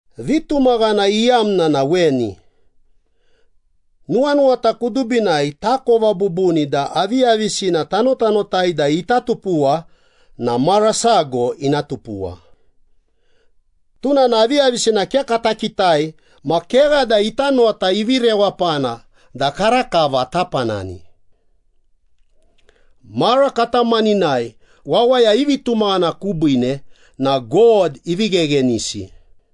Vitumaghana iyamna na weni. Nuwanuwata kudubinai takova bubuni da aviyavisina tanotanotai da ita tupuwa na mara sago ina tupuwa. Tuna na aviyavisina ke kata kitai ma kegha da ita nota ivi rewapana da karakava tapanani. Mara katamaninai, wawaya i vitumaghana kubiine na God ivi gheghenisi.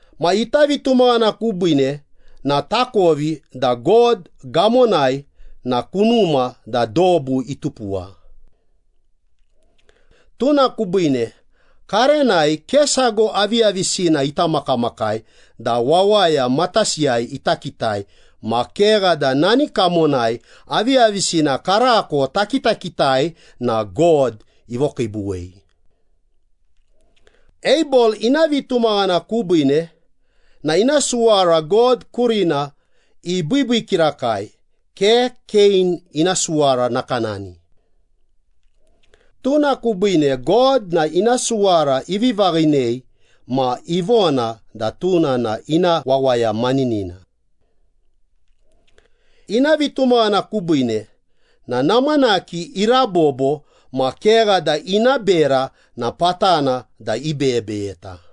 Ma ita vitumaghana kubiine na takovi da God gamonai na kunuma da dobu itupuwa. Tuna kubiine, karenai ke sago aviyavisina ita makamakai da wawaya matasiyai ita kitai ma kegha da nani kamonai aviyavisina karako takitakitai na God ivokiibuwei. Abel ina vitumaghana kubiine na ina suwara God kurina ibiibii kirakai, ke Kein ina suwara nakanani. Tuna kubiine God na ina suwara ivi vaghinei ma ivona da tuna na ina wawaya maninina. Ina vitumaghana kubiine na namanaki irabobo ma kegha da ina bera na patana da ibeyebeyeta.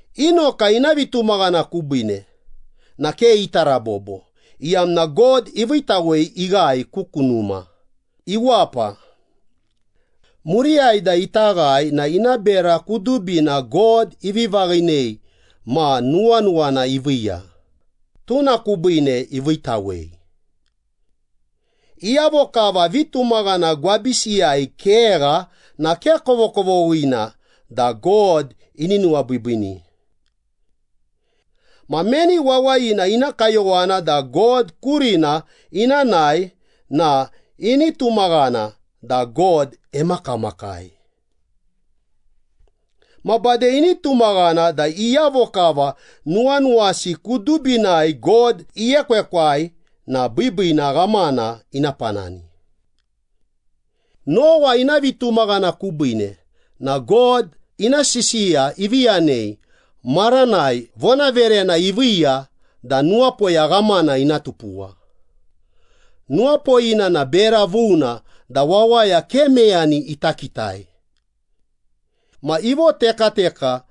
Inoka ina vitumaghana kubiine na ke ita rabobo, iyamna God iviitawei ighae ku kunuma, iwapa. Muriyai da ita ghae na ina bera kudubina God ivi vaghinei ma nuwanuwana iviiya, tuna kubiine iviitawei. Iyavo kava vitumaghana gwabisiyai kegha na ke kovokovoghina da God ini nuwabiibiini. Ma meni wawayina ina kayowana da God kurina ina nae na ini tumaghana da God emakamakai. Ma bade ini tumaghana da iyavo kava nuwanuwasi kudubinai God iekwekwai na biibiina ghamana ina panani. Nowa ina vitumaghana kubiine na God ina sisiya ivi yanei maranai vonaverena iviiya da nuwapoya ghamana ina tupuwa. Nuwapoyina na bera vuna da wawaya ke meyani ita kitai. Ma ivotekateka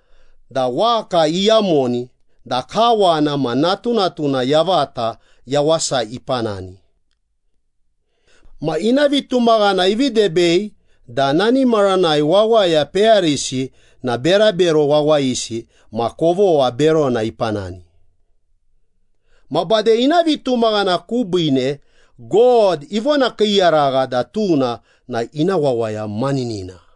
da waka iyamoni da kawana ma natunatuna yavata yawasa ipanani. Ma ina vitumaghana ivi debei da nani maranai wawaya peyarisi na berabero wawayisi ma kovogha berona ipanani. Ma bade ina vitumaghana kubiine God ivonakiiyaragha da tuna na ina wawaya maninina.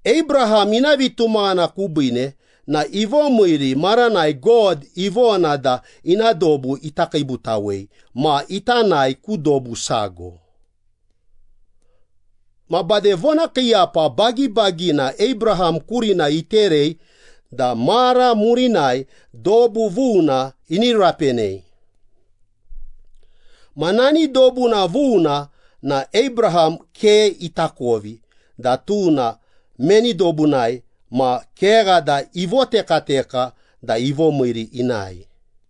Abraham ina vitumaghana kubiine na ivomiiri maranai God ivona da ina dobu ita kiibutawei ma ita nae ku dobu sago. Ma bade vonakiiyapa bagibagina Abraham kurina iterei da mara murinai dobu vuna ini rapenei. Ma nani dobuna vuna na Abraham ke itakovi da tuna meni dobunai ma kegha da ivotekateka da ivomiiri inae.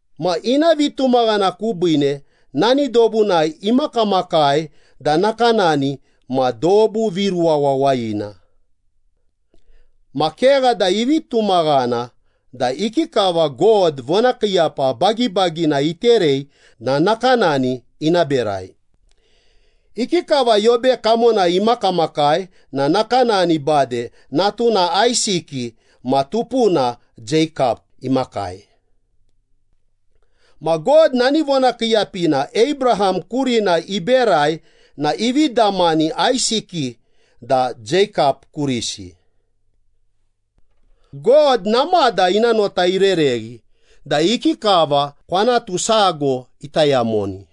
Ma ina vitumaghana kubiine nani dobunai imakamakai da nakanani ma dobu viruwa wawayina. Ma kegha da ivi tumaghana da ikikava God vonakiiyapa bagibagina iterei na nakanani ina berai. Ikikava yobe kamonai imakamakai na nakanani bade natuna Aisiki ma tupuna Jeikap imakai. Ma God nani vonakiiyapina Abraham kurina iberai na ivi damani Aisiki da Jeikap kurisi. God namada ina nota irereghi da ikikava kwanatu sago ita yamoni,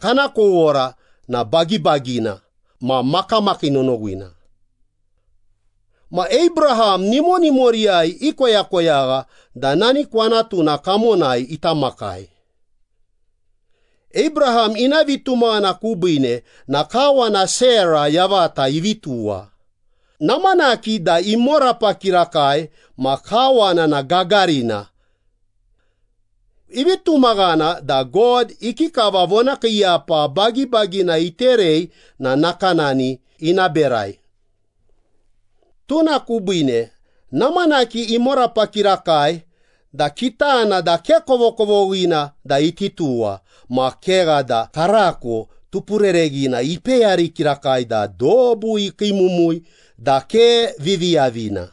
kana kowora na bagibagina ma makamakii nonowina. Ma Abraham nimonimoriyai ikoyakoyagha da nani kwanatuna kamonai ita makai. Abraham ina vitumaghana kubiine na kawana Sera yavata ivi tuwa, namanaki da imorapa kirakai ma kawana na gagarina. Ivi tumaghana da God ikikava vonakiiyapa bagibagina iterei na nakanani ina berai. Tuna kubiine namanaki imorapa kirakai da kitana da ke kovokovoghina da iti tuwa ma kegha da karako tupurereghina ipeyari kirakai da dobu ikiimumui da ke viviyavina,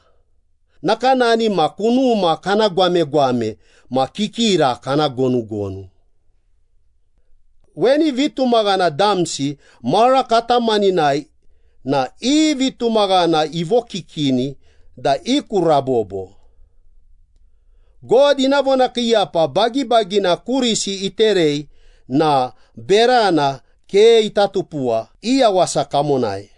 nakanani ma kunuma kana gwamegwame ma kikira kana gonugonu. Weni vitumaghana damsi mara katamaninai na i vitumaghana ivokikini da i ku rabobo. God ina vonakiiyapa bagibagina kurisi iterei na berana ke ita tupuwa i yawasa kamonai.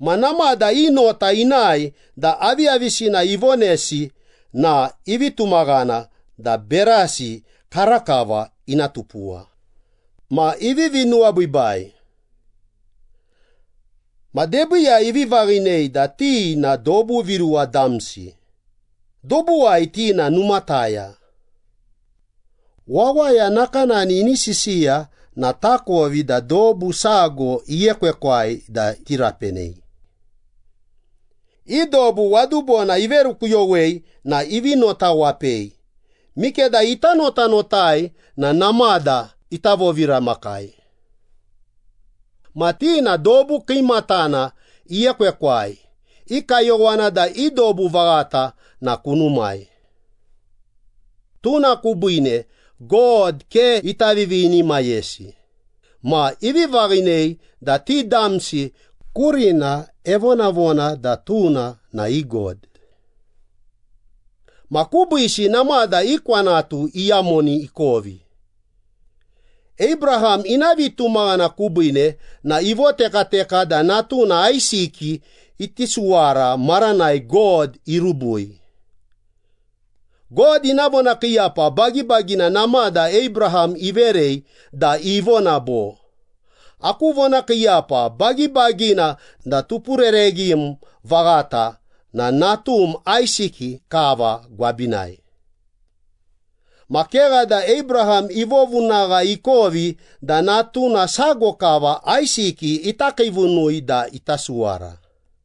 Ma namada i nota inae da aviyavisina ivonesi na ivi tumaghana da berasi karakava ina tupuwa, ma ivivi nuwabiibai. Ma debiiyai ivi vaghinei da ti na dobu viruwa damsi, dobuwai ti na numataya. Wawaya nakanani ini sisiya na takovi da dobu sago iekwekwai da iti rapenei. I dobu wadubona iverukuyowei na ivi notawapei, mikeda ita notanotai na namada ita voviramakai. Ma ti na dobu kiimatana iekwekwai, i kayowana da i dobu vaghata na kunumai. Tuna kubiine God ke ita vivinimayesi ma ivi vaghinei da ti damsi kurina evonavona da tuna na i God. Ma kubiisi namada i kwanatu iyamoni ikovi. Abraham ina vitumaghana kubiine na ivotekateka da natuna Aisiki iti suwara maranai God irubui. God ina vonakiiyapa bagibagina namada Abraham iverei da ivona bo, “Aku vonakiiyapa bagibagina da tupurereghim vaghata na natum Aisiki kava gwabinai.” Ma kegha da Abraham ivovunagha ikovi da natuna sago kava Aisiki ita kiivunui da ita suwara.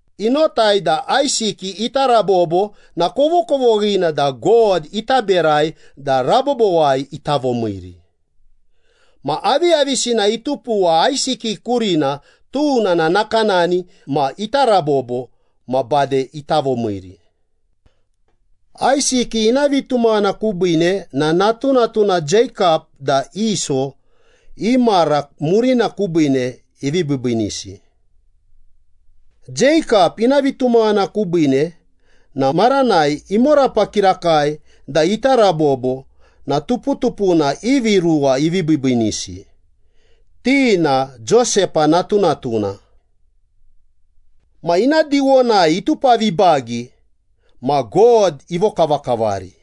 Inotai da Aisiki ita rabobo na kovokovoghina da God ita berai da rabobowai ita vomiiri. Ma aviyavisina itupuwa Aisiki kurina, tuna na nakanani ma ita rabobo ma bade ita vomiiri. Aisiki ina vitumaghana kubiine na natunatuna Jeikap da Iso i mara murina kubiine ivi biibiinisi. Jeikap ina vitumaghana kubiine na maranai imorapa kirakai da ita rabobo na tuputupuna ivi ruwa ivi biibiinisi, ti na Josepa natunatuna. Ma ina diwonai itupavibagi ma God ivokavakavari.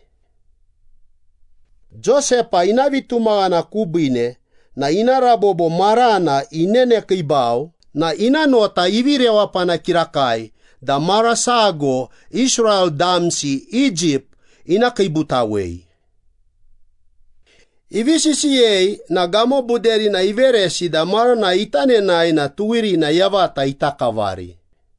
Josepa ina vitumaghana kubiine na ina rabobo marana inenekiibau na ina nota ivi rewapana kirakai da mara sago Israel damsi Egypt ina kiibutawei. Ivi sisiyei na gamobuderina iveresi da maranai ita nenae na tuwirina yavata ita kavari.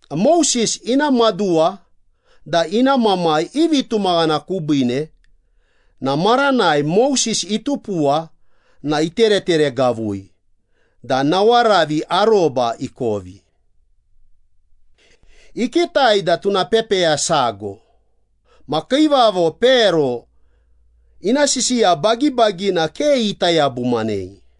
Moses ina maduwa da ina mamai i vitumaghana kubiine na maranai Moses itupuwa na itereteregavui da nawaravi aroba ikovi. Ikitai da tuna pepeya sago, ma kiivavo Pero ina sisiya bagibagina ke ita yabumanei.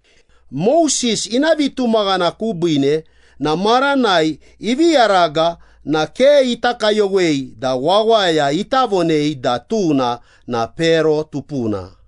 Moses ina vitumaghana kubiine na maranai ivi yaraga na ke ita kayowei da wawaya ita vonei da tuna na Pero tupuna.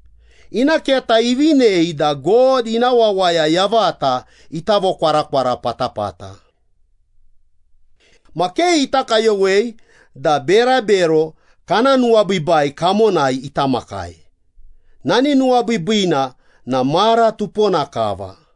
Ina keta ivinei da God ina wawaya yavata ita vokwarakwara patapata. Ma ke ita kayowei da berabero kana nuwabiibai kamonai ita makai, nani nuwabiibiina na mara tupona kava.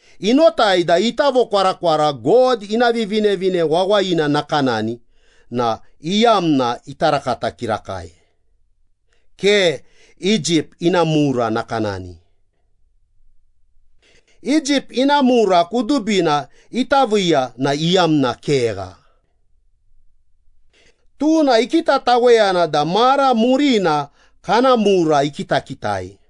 Inotai da ita vokwarakwara God ina Vivinevine Wawayina nakanani na iyamna ita rakata kirakai, ke Egypt ina mura nakanani. Egypt ina mura kudubina ita viiya na iyamna kegha. Tuna ikitataweyana da mara murina kana mura ikitakitai.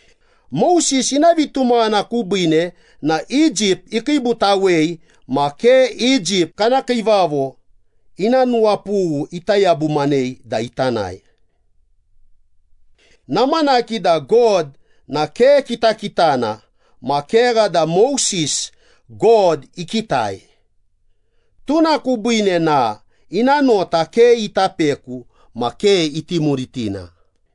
Moses ina vitumaghana kubiine na Egypt ikiibutawei ma ke Egypt kana kiivavo ina nuwapughu ita yabumanei da ita nae. Namanaki da God na ke kitakitana ma kegha da Moses, God ikitai. Tuna kubiine na ina nota ke ita peku ma ke iti muritina.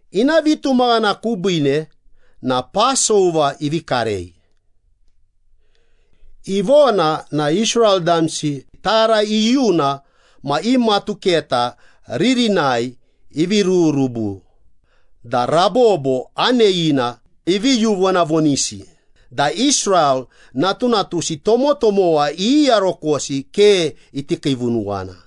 Ina vitumaghana kubiine na Pasova ivi karei. Ivona na Israel damsi tara iyuna ma i matuketa ririnai ivi rururubu da rabobo aneyina ivi yuvonavonisi da Israel natunatusi tomotomowa iyiyarokosi ke iti kiivunuwana.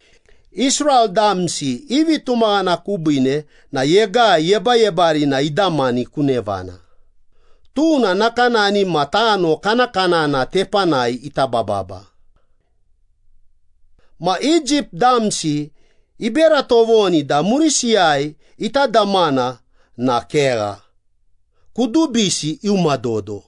Israel damsi i vitumaghana kubiine na Yegai Yebayebarina idamani ku nevana, tuna nakanani ma tano kanakanana tepanai ita bababa. Ma Egypt damsi ibera tovoni da murisiyai ita damana na kegha, kudubisi iuma dodo.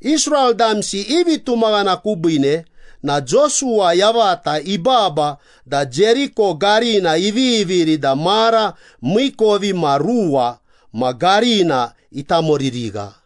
Israel damsi i vitumaghana kubiine na Josuwa yavata ibaba da Jeriko garina iviviri da mara miikovimaruwa ma garina itamoririgha.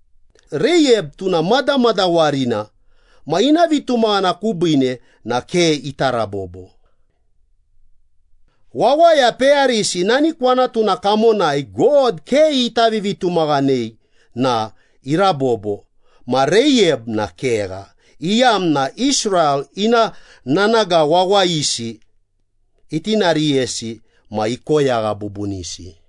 Reiyab tuna madamadawarina ma ina vitumaghana kubiine na ke ita rabobo. Wawaya peyarisi nani kwanatuna kamonai God ke ita vivitumaghanei na irabobo ma Reiyab na kegha, iyamna Israel ina nanaga wawayisi itinariyesi ma ikoyagha bubunisi.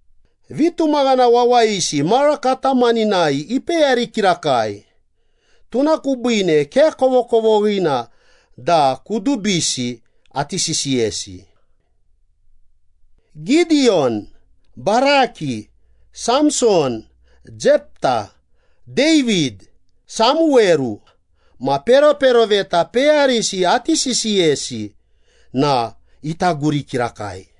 Vitumaghana wawayisi mara katamaninai ipeyari kirakai, tuna kubiine ke kovokovoghina da kudubisi ati sisiyesi. Gidiyon, Baraki, Samson, Jepta, David, Samuweru, ma peroperoveta peyarisi ati sisiyesi na ita guri kirakai.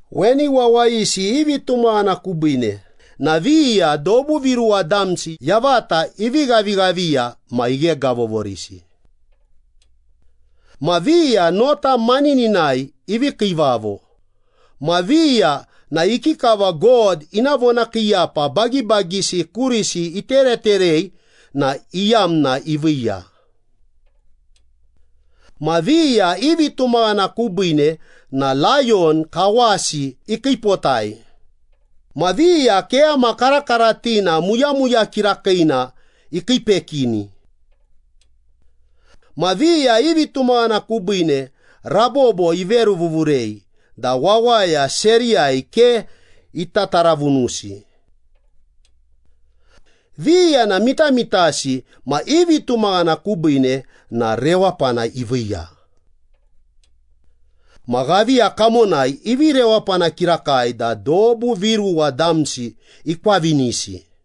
Weni wawayisi i vitumaghana kubiine na viya dobu viruwa damsi yavata ivi ghavighaviya ma ighegavovorisi. Ma viya nota manininai ivi kiivavo, ma viya na ikikava God ina vonakiiyapa bagibagisi kurisi itereterei na iyamna iviiya. Ma viya i vitumaghana kubiine na layon kawasi ikiipotai, ma viya keyama karakaratina, muyamuya kirakiina ikiipekini. Ma viya i vitumaghana kubiine rabobo iveruvuvurei da wawaya seriyai ke ita taravunusi. Viya na mitamitasi ma i vitumaghana kubiine na rewapana iviiya. Ma ghaviya kamonai ivi rewapana kirakai da dobu viruwa damsi ikwavinisi.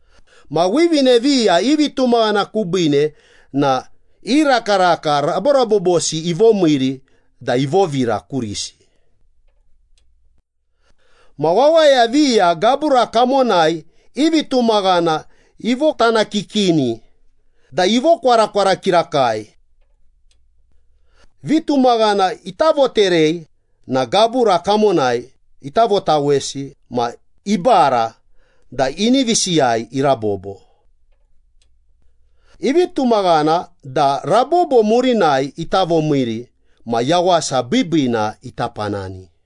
Ma wivine viya i vitumaghana kubiine na i rakaraka raborabobosi ivomiiri da ivovira kurisi. Ma wawaya viya gabura kamonai i vitumaghana ivotanakikini da ivokwarakwara kirakai. Vitumaghana ita voterei na gabura kamonai ita votawesi ma ibara da inivisiyai irabobo. Ivi tumaghana da rabobo murinai ita vomiiri ma yawasa biibiina ita panani.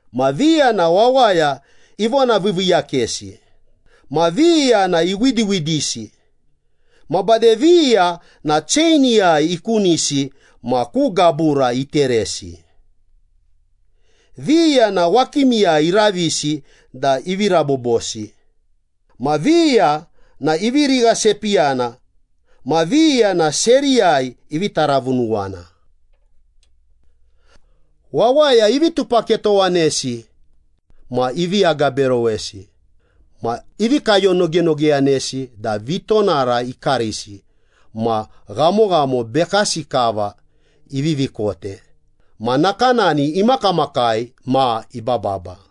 Ma viya na wawaya ivonaviiviiyakesi, ma viya na iwidiwidisi, ma bade viya na cheiniyai ikunisi ma ku gabura iteresi. Viya na wakimiyai iravisi da ivi rabobosi, ma viya na ivi righasepiyana, ma viya na seriyai ivi taravunuwana. Wawaya ivi tupaketowanesi ma ivi agaberowesi ma ivi kayonogenogeyanesi da vitonara ikarisi ma ghamoghamo bekasi kava ivivi kote ma nakanani imakamakai ma ibababa.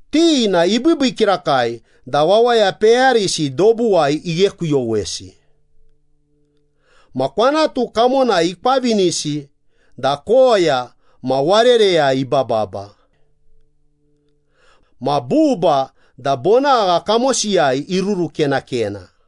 Ti na ibiibii kirakai da wawaya peyarisi dobuwai ighekuyowesi. Ma kwanatu kamonai ikwavinisi da koya ma warereyai ibababa. Ma buba da bonagha kamosiyai irurukenakena.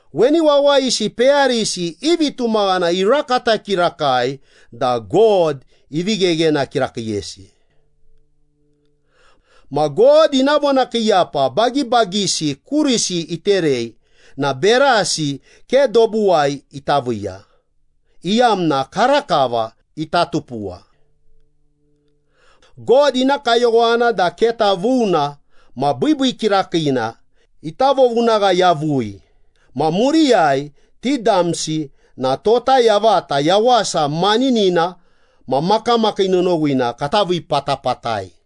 Weni wawayisi peyarisi i vitumaghana irakata kirakai da God ivi gheghena kirakiiyesi. Ma God ina vonakiiyapa bagibagisi kurisi iterei na berasi ke dobuwai ita viiya, iyamna karakava ita tupuwa. God ina kayowana da keta vuna ma biibii kirakiina ita vovunagha yavui ma muriyai ti damsi na tota yavata yawasa maninina ma makamakii nonowina kata vii patapatai.